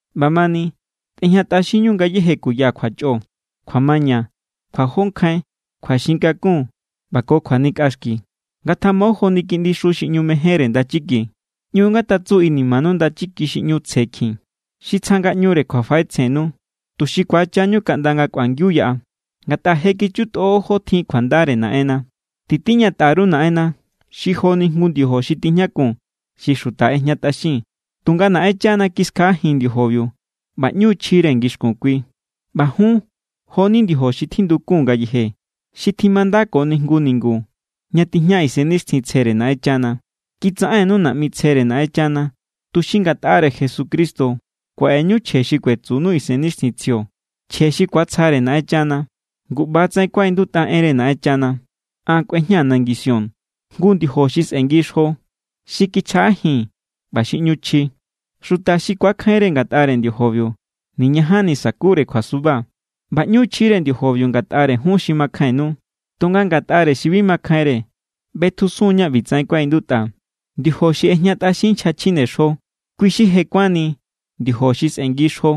ꞌBamani, tꞌejñatꞌaxinñu ngayéje kuya kjuachꞌo, kjuamaña, kjuajonkjain, kjuaxin kakun ꞌba ko kjuanikꞌaxki. Ngatjamo joni kiꞌndixu xi ꞌñu mejénre ndachiki. ꞌÑu ngatatsu inimanu ndachiki xi ꞌñu tsje kjin, xi tsja ngaꞌñure kjuafaꞌetsjennu, tuxi ku̱achañu kaꞌnda nga kꞌuangiu yaꞌa. Ngatꞌa je kichutꞌo jó tjin kjuandare Naꞌenna. Titiñatꞌa_ru Naꞌenna xi joni jngu ndiojo xi tijñakun xi xuta ꞌejñatꞌaxin. Tunga Naꞌenchana kiskjaꞌajin ndiojobiu ꞌba ꞌñu= chjire ngixkun kui. ꞌBa jun jo=ni ndiojo xi tjindukun ngayeje, xi tjimandakoni jngu ningu ña tijña Isennixtjintsjere Naꞌenchana. Kitsaꞌennu naꞌmi tsjere Naꞌenchana, tuxi ngatꞌare Jesucristo kuaꞌeñu chje xi kuetsunu Isennixtjintsjio, chje xi ku̱atsjare Naꞌenchana. Ngu ꞌba=tsaꞌen kuaꞌindutꞌa enre Naꞌenchana: An kꞌuejñaa̱ nangi Sión jngu ndiojo xi sꞌengi xjo, xi kichjaꞌajin ꞌba xi ꞌñu chji. Xuta xi ku̱akjainre ngatꞌare ndiojobiu, niñajanni sa̱kure kjuasuba. ꞌBa ꞌñu= chjire ndiojobiu ngatꞌare jun xi makjainnu. Tunga ngatꞌare xi bi makjainre, ꞌbetjusun ña ꞌbitsaꞌen kuaꞌindutꞌa: Ndiojo xi ꞌejñatꞌaxin nchja chjinexjo, kui xi je kuánni ndiojo xi sꞌengi xjo.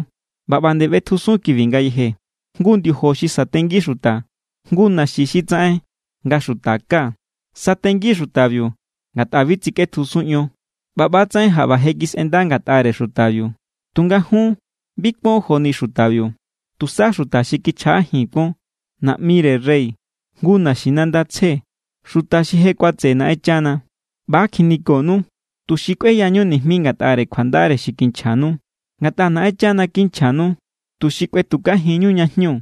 ꞌBa ꞌba=nde ꞌbetjusun kibi ngayeje: Jngu ndiojo xi satengi xuta, jngu naxi xi tsaꞌen nga xuta ká. Satengi= xutabiu ngatꞌa bi tsikꞌetjusun ion. ꞌBa ꞌba=tsaꞌen jaꞌba je kisꞌenda ngatꞌare xutabiu. Tunga jun bi kuon joni xutabiu. Tusa xuta xi kichjaꞌajin kuon, naꞌmire rey, jngu naxinanda tsje, xuta xi je kuatseꞌe Naꞌenchana. ꞌBa= kjinikonu, tuxi kꞌueyañu nijmi ngatꞌare kjuandare xi kinchjanu. Ngatꞌa Naꞌenchana kinchjanu tuxi kꞌuetukajinñu ña jñu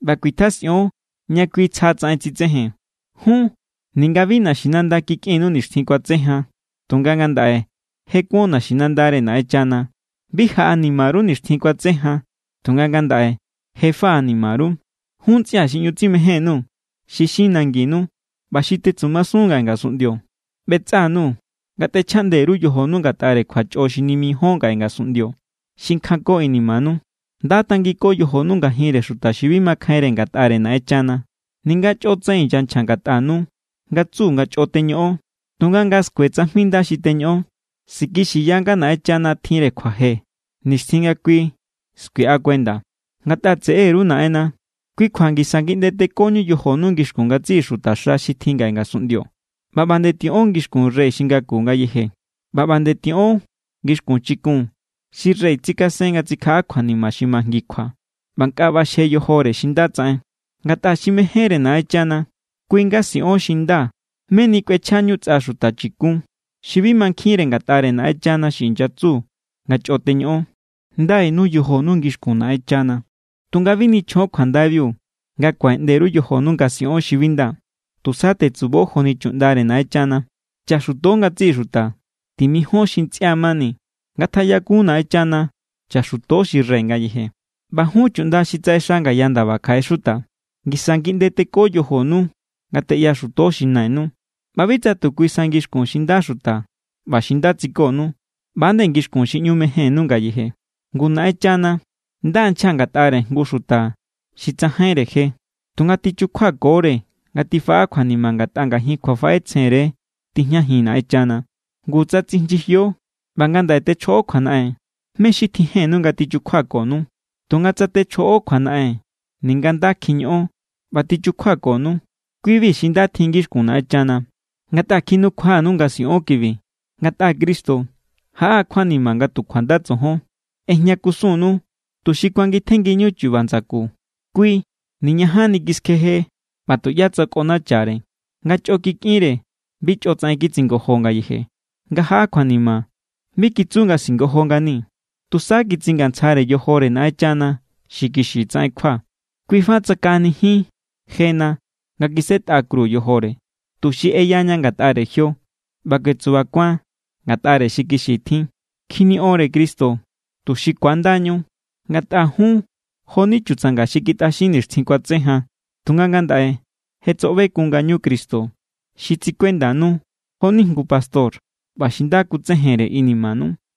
ꞌba kuitjasꞌion ña kui tsjatsaꞌen tsitsejen. Jun ninga bi naxinanda kikꞌinnu nixtjin kuatse jan, tunga ngandaꞌe je kuon naxinandare Naꞌenchana. Bi jaꞌanima_ru nixtjin kuatse jan, tunga ngandaꞌe je faꞌanima_ru. Jun ntsꞌia̱ xi ꞌñu tsimején_nuu̱ xi xin nanginu ꞌba xi tetsumasun ngaꞌe ngasunꞌndio, ꞌbetsꞌa_nuu̱ nga tꞌechjaꞌnde_ru yojonu ngatꞌare kjuachꞌo xi nimijíon ngaꞌe ngasunꞌndio, xi kjanko inimanu. Nda tangiko yojonu ngajinre xuta xi bi makjainre ngatꞌare Naꞌenchana. Ninga chꞌotsaꞌen inyanchja ngatꞌanu nga tsu nga chꞌo teñoꞌon, tunga nga skue tsajmi nda xi teñoꞌon, sikixiya nga Naꞌenchana tjinre kjuaje nixtjin nga kui skuiꞌa kuenda. Ngatꞌa tseꞌeru Naꞌenna, kui kjua ngisa ngiꞌnde tekoñu yojonu ngixkun ngatsiꞌi xutaxa xi tjin ngaꞌe ngasunꞌndio. ꞌBa ꞌba nde tiꞌon ngixkun rey xi ngaku ngayeje, ꞌba ꞌba nde tiꞌon ngixkun chikun xi rey tsikasen nga tsikjaꞌa kjuanima xi majngikjua ꞌba nga nkꞌa ꞌbaxje xi nda tsaꞌen. Ngatꞌa xi mejénre Naꞌenchana, kui= nga siꞌon xi nda meni kꞌuechjañu tsꞌa xuta chi̱kun xi bi mankjinre ngatꞌare Naꞌenchana xi inyatsu nga chꞌo teñoꞌon. Ndainu yojonu ngixkun Naꞌenchana, tunga bi nichjon kjuandaibiu nga kuaꞌeꞌnde_ru yojonu nga siꞌon xi bi nda. Tusa tetsubo joni chuꞌndare Naꞌenchana. Chaxuto ngatsiꞌi xuta. Timijón xi ntsꞌia mani. Ngatjaꞌyakun Naꞌenchana. Chaxuto xi rey ngayeje. ꞌBa jun chuꞌnda xi tsaꞌexa ngaya ndaba kjaꞌe xuta, ngisa ngiꞌnde teko yojonu nga teꞌyaxuto xi nainu, ꞌba bi tsa tu kui sa ngixkun xi nda xuta ꞌba xi nda tsikonu, ꞌba=nde ngixkun xi ꞌñu mejennu ngayeje. Ngu Naꞌenchana nda= nchja ngatꞌare jngu xuta xi tsajainre je, tunga tichukjuakore nga tifaꞌa kjuanima ngatꞌa ngajin kjuafaꞌetsjenre tijñajin Naꞌenchana. Ngu, tsa tsinyijio ꞌba ngandaꞌe techjoꞌo kjuanaꞌen, ¿mé= xi tjijennu nga tichukjuakonu? Tunga tsa techjoꞌo kjuanaꞌen ninga nda kjiñoꞌon ꞌba tichukjuakonu, kui=bi xi nda tjin ngixkun Naꞌenchana. Ngatꞌa kjinukjuanu nga siꞌon kibi, ngatꞌa Cristo jaꞌa= kjuanima nga tu kjuanda tsojon. ꞌEjña kusunnu, tuxi kuangitjenngiñu chuba ndsaku. Kui niñajanni kiskjeje ꞌba tuꞌyá tsakꞌonachare. Nga chꞌo kikꞌinre, bi chꞌotsaꞌen kitsingojo ngayeje. Nga jaꞌa kjuanima, bi kitsu nga singojo ngani. Tusa kitsingantsjare yojore Naꞌenchana xi kixi tsaꞌen kjua. Kui fa tsakaꞌanijin jena nga kisꞌetꞌa kru yojore, tuxi eyaña ngatꞌare jio ꞌba kuetsubakuan ngatꞌare xi kixi tjin. Kjiniꞌon=re Cristo, tuxi kuandañu. Ngatꞌa jun jo=ni chutsanga xi kitꞌaxin nixtjin kuatse jan. Tunga ngandaꞌe je tsoꞌbekun ngañu Cristo xi tsikuendanu joni jngu pastor ꞌba xi nda kutsejenre inimanu.